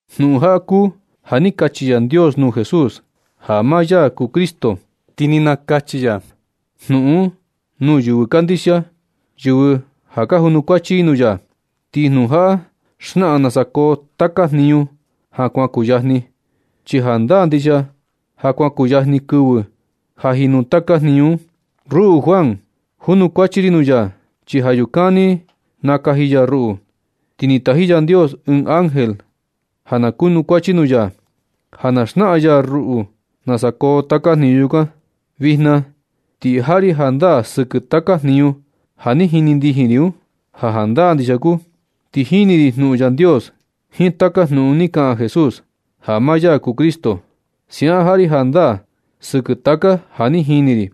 Jnuꞌun jaꞌa kuu ja ni kachi Yandios nuu Jesús, ja maa ya kuu Cristo. Ti ni nakachi ya jnuꞌun un nuu yɨvɨ kandixia, yɨvɨ ja ka junukuachi i nuu ya. Ti jnuꞌun jaꞌa xnaꞌan nasa koo taka jniñu ja kuan kuyajni. Chi jandaa ndixia ja kuan kuyajni kɨvɨ ja jinu taka jniñu un. Ruꞌu Juan, junukuachi ri nuu ya, chi ja yukan ni nakaji ya ruꞌu. Ti ni taji Yandios ɨɨn ángel ja junukuachi nuu ya, ja na xnaꞌan ya ruꞌu nasa koo taka jniñu yukan. Vijna ti jaꞌa ri jandaa sɨkɨ taka jniñu ja ni jini ndijin ri un, ja jandaa ndixia kuu. Ni jini ri jnuꞌun Yandios jiin taka jnuꞌun ni kaꞌan Jesús, ja maa ya kuu Cristo. Siaꞌan jaꞌa ri jandaa sɨkɨ taka ja ni jini ri.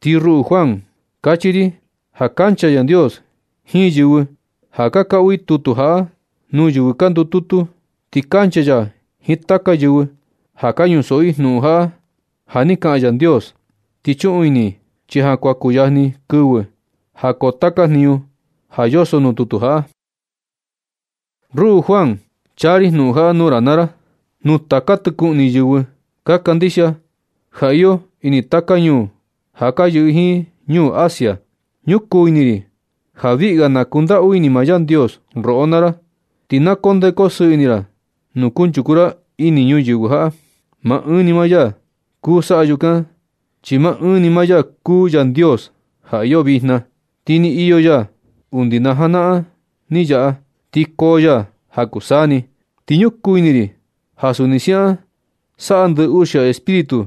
Ti ruꞌu Juan, kachi ri ja kancha Yandios jiin yɨvɨ ja kaꞌu i tutu jaꞌa nuu yɨvɨ ka ndututu. Ti kancha ya jiin taka yɨvɨ ja ka ñusoꞌo i jnuꞌun jaꞌa ja ni kaꞌan Yandios, ti chuꞌun ini i. Chi ja kuan kuyajni kɨvɨ ja koo taka jniñu ja yoso nuu tutu jaꞌa. Ruꞌu Juan, chaa ri jnuꞌun jaꞌa nuu ra naa ra, nuu taka tɨkuꞌni yɨvɨ ka kandixia ja iyo ini taka ñuu ja ka yɨꞌɨ jiin ñuu Asia. Ñukuu ini ri ja viꞌga na kundaꞌu ini maa Yandios roꞌo naa ra, ti na kondee kosɨɨ ini ra nu kunchuku ra ini ñuyɨvɨ jaꞌa. Maa ɨɨn ni maa ya kuu saꞌa yukan chi maa ɨɨn ni maa ya kuu Yandios ja iyo vijna, ti ni iyo ya undi na janꞌan ni yaꞌa, ti koo ya ja kuu saa ni. Ti ñukuu ini ri ja suni siaꞌan saꞌa ndɨ uxia Espíritu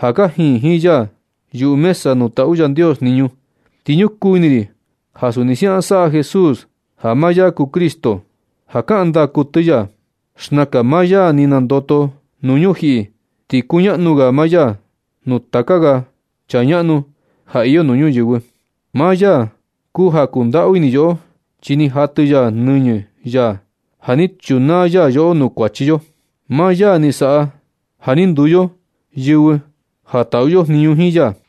ja kajin jiin ya yuꞌu mesa nuu taꞌu Yandios jniñu. Ti ñukuu ini ri ja suni siaꞌan saꞌa Jesús, ja maa ya kuu Cristo, ja kaꞌan ndaa kuɨtɨ ya. Xnakan maa ya ni nandoto nuu ñujiꞌi, ti kuñaꞌnu ga maa ya nuu taka ga chaa ñaꞌnu ja iyo nuu ñuyɨvɨ. Maa ya kuu ja kundaꞌu ini yoꞌo, chi ni jatɨ ya nɨñɨ ya ja ni chunaa ya yoꞌo nuu kuachi yo. Maa ya ni saꞌa ja ni nduu yo yɨvɨ ya ja taꞌu yo jniñu jiin ya.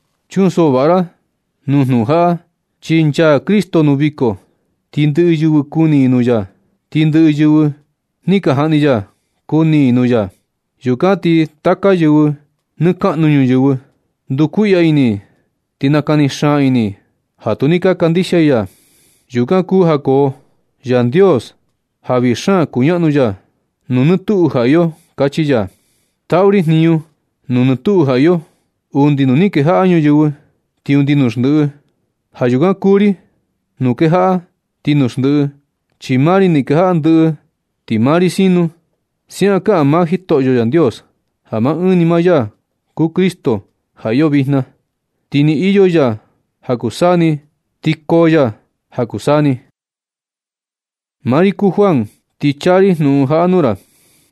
Chunsoꞌo vaꞌa ra nuu jnuꞌun jaꞌa chi nchaa Cristo nuu viko, ti ndɨꞌɨ yɨvɨ kuni i nuu ya, ti undi yɨvɨ ni ka jaꞌni ya kuni i nuu ya. Yukan ti taka yɨvɨ nɨ kaꞌnu ñuyɨvɨ, ndukuiꞌya ini i ti nakani xaan ini i ja tu ni kandixia i ya. ¡Yukan kuu ja koo! Yandios ja vii xaan kuñaꞌnu ya nuu nɨ tuꞌu ja iyo kachi ya: “Taꞌu ri jniñu nuu nɨ tuꞌu ja iyo, undi nuu ni kejaꞌa ñuyɨvɨ ti undi nuu xndiꞌi. Ja yukan kuu ri nanu letra A jiin Z, nuu kejaꞌa ti nuu xndiꞌi, chi maa ri ni kejaꞌa ndɨꞌɨ ti maa ri sinu.” Siaꞌan kaꞌan maa Jitoꞌo Yandios ja maa ɨɨn ni maa ya kuu Yandios ja iyo vijna, ti ni iyo ya ja kuu saa ni yaꞌa, ti koo ya ja kuu saa ni. Maa ri kuu Juan ti chaa ri jnuꞌun jaꞌa nuu ra naa ra.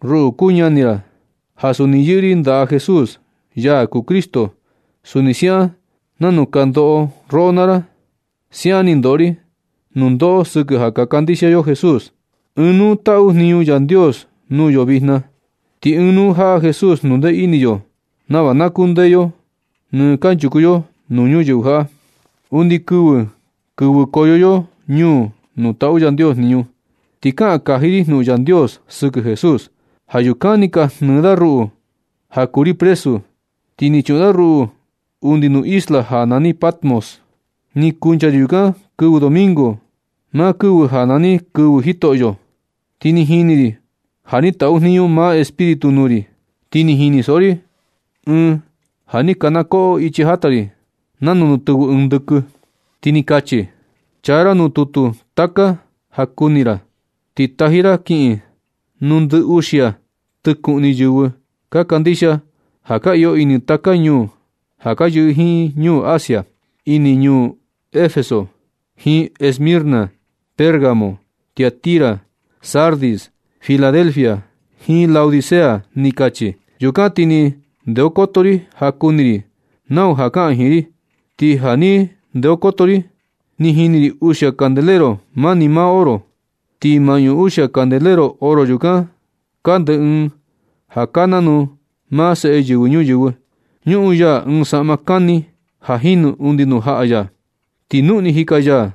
Ruꞌu kuu ñani ra ja suni yɨꞌɨ ri ndaꞌa Jesús, ya kuu Cristo. Suni siaꞌan nanu ka ndoꞌo roꞌo naa ra siaꞌan ni ndoꞌo ri nundoꞌo sɨkɨ ja ka kandixia yo Jesús. Ɨɨn nuu taꞌu jniñu Yandios nuu yo vijna, ti ɨɨn nuu jaꞌa Jesús jnundee ini yo nava na kundee yo nɨ kanchuku yo nuu ñuyɨvɨ jaꞌa, undi kɨvɨ kɨvɨkoyo yo ñuu nuu taꞌu Yandios jniñu. Ni kaꞌan kaji ri jnuꞌun Yandios sɨkɨ Jesús. Ja yukan ni ka jnɨɨ da ruꞌu ja kuu ri presu, ti ni chuꞌun da ruꞌu undi nuu isla ja nani Patmos. Ni kuncha ri yukan kɨvɨ domingo, maa kɨvɨ ja nani kɨvɨ Jitoꞌo. Ti ni jini ri ja ni taꞌu jniñu maa Espíritu nuu ri, ti ni jinisoꞌo ri ɨɨn ja ni kana koꞌo ichi jata ri nanu nu tɨvɨ ɨɨn ndɨkɨ, ti ni kachi: ―Chaa ra nuu tutu taka ja kuni ra. Ti taji ra kiꞌin nuu ndɨ uxia tɨkuꞌni yɨvɨ ka kandixia ja ka iyo ini taka ñuu ja ka yɨꞌɨ jiin ñuu Asia, ini ñuu Efeso, jiin Esmirna, Pérgamo, Tiatira, Sardis, Filadelfia, jiin Laodicea ―ni kachi. Yukan ti ni ndeokoto ri ja kuni ri nau ja kaꞌan jiin ri. Ti ja ni ndeokoto ri, ni jini ri uxia candelero mani maa oro. Ti maꞌñu uxia candelero oro yukan kande ɨɨn ja kaa nanu maa Seꞌe Yɨvɨ Ñuyɨvɨ. Ñuꞌun ya ɨɨn saꞌma kani ja jinu undi nuu jaꞌa ya. Ti nuꞌni jika ya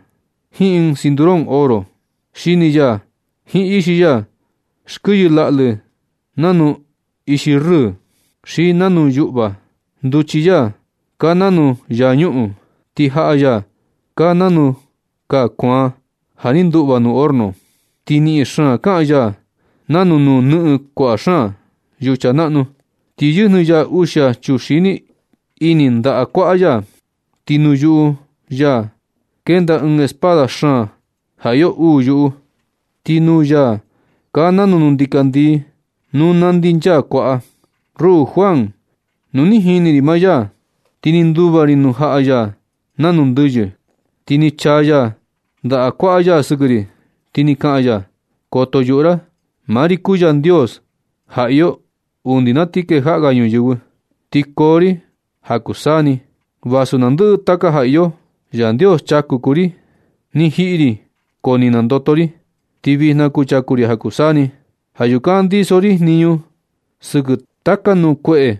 jiin ɨɨn cinturón oro. Xini ya jiin ixi ya skuɨyɨ laꞌlɨ nanu ixi rɨɨ, xi nanu yuꞌva. Nduchi ya kaa nanu yaa ñuꞌun. Ti jaꞌa ya kaa nanu kaa kuaan ja ni nduꞌva nuu horno. Ti niꞌin xaan kaꞌan ya nanu nu nɨꞌɨn kuaꞌa xaan yucha naꞌnu. Ti yɨjnɨ ya uxia chuxini ini ndaꞌa kuaꞌa ya. Ti nuu yuꞌu ya kenda ɨɨn espada xaan ja iyo uu yuꞌu. Ti nuu ya kaa nanu nuu ndikandii nu nandinchaa kuaꞌa. Ruꞌu Juan, nu ni jini ri maa ya, ti ni nduva ri nuu jaꞌa ya nanu ndɨyɨ. Ti ni chaa ya ndaꞌa kuaꞌa ya sɨkɨ ri, ti ni kaꞌan ya: ―Koto yuꞌu ra. Maa ri kuu Yandios ja iyo undi na ti kejaꞌa ga ñuyɨvɨ, ti koo ri ja kuu saa ni vasu na ndɨꞌɨ taka ga ja iyo. Yandios chaku kuu ri. Ni jiꞌi ri ko ni nandoto ri, ti vijna kuchaku ri ja kuu saa ni. Ja yukan ndiso ri jniñu sɨkɨ taka nuu kueꞌe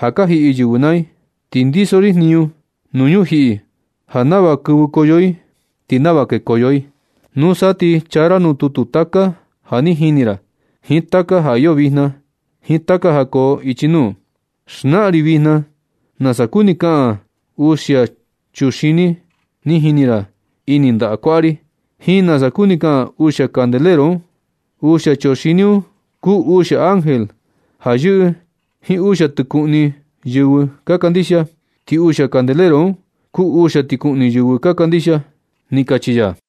ja ka jiꞌi yɨvɨ naa i. Ti ndiso ri jniñu nuu ñujiꞌi ja nava kɨvɨkoyo i ti nava kekoyo i. Nusa ti chaa ra nuu tutu taka ja ni jini ra, jiin taka ja iyo vijna, jiin taka ja koo ichi nuu. Xnaꞌan ri vijna nasa kuni kaꞌan uxia chuxini ni jini ra ini ndaꞌa kuaꞌa ri, jiin nasa kuni kaꞌan uxia candelero un. Uxia chuxini un kuu uxia ángel ja yɨꞌɨ jiin uxia tɨkuꞌni yɨvɨ ka kandixia. Ti uxia candelero un kuu uxia tɨkuꞌni yɨvɨ ka kandixia ―ni kachi ya.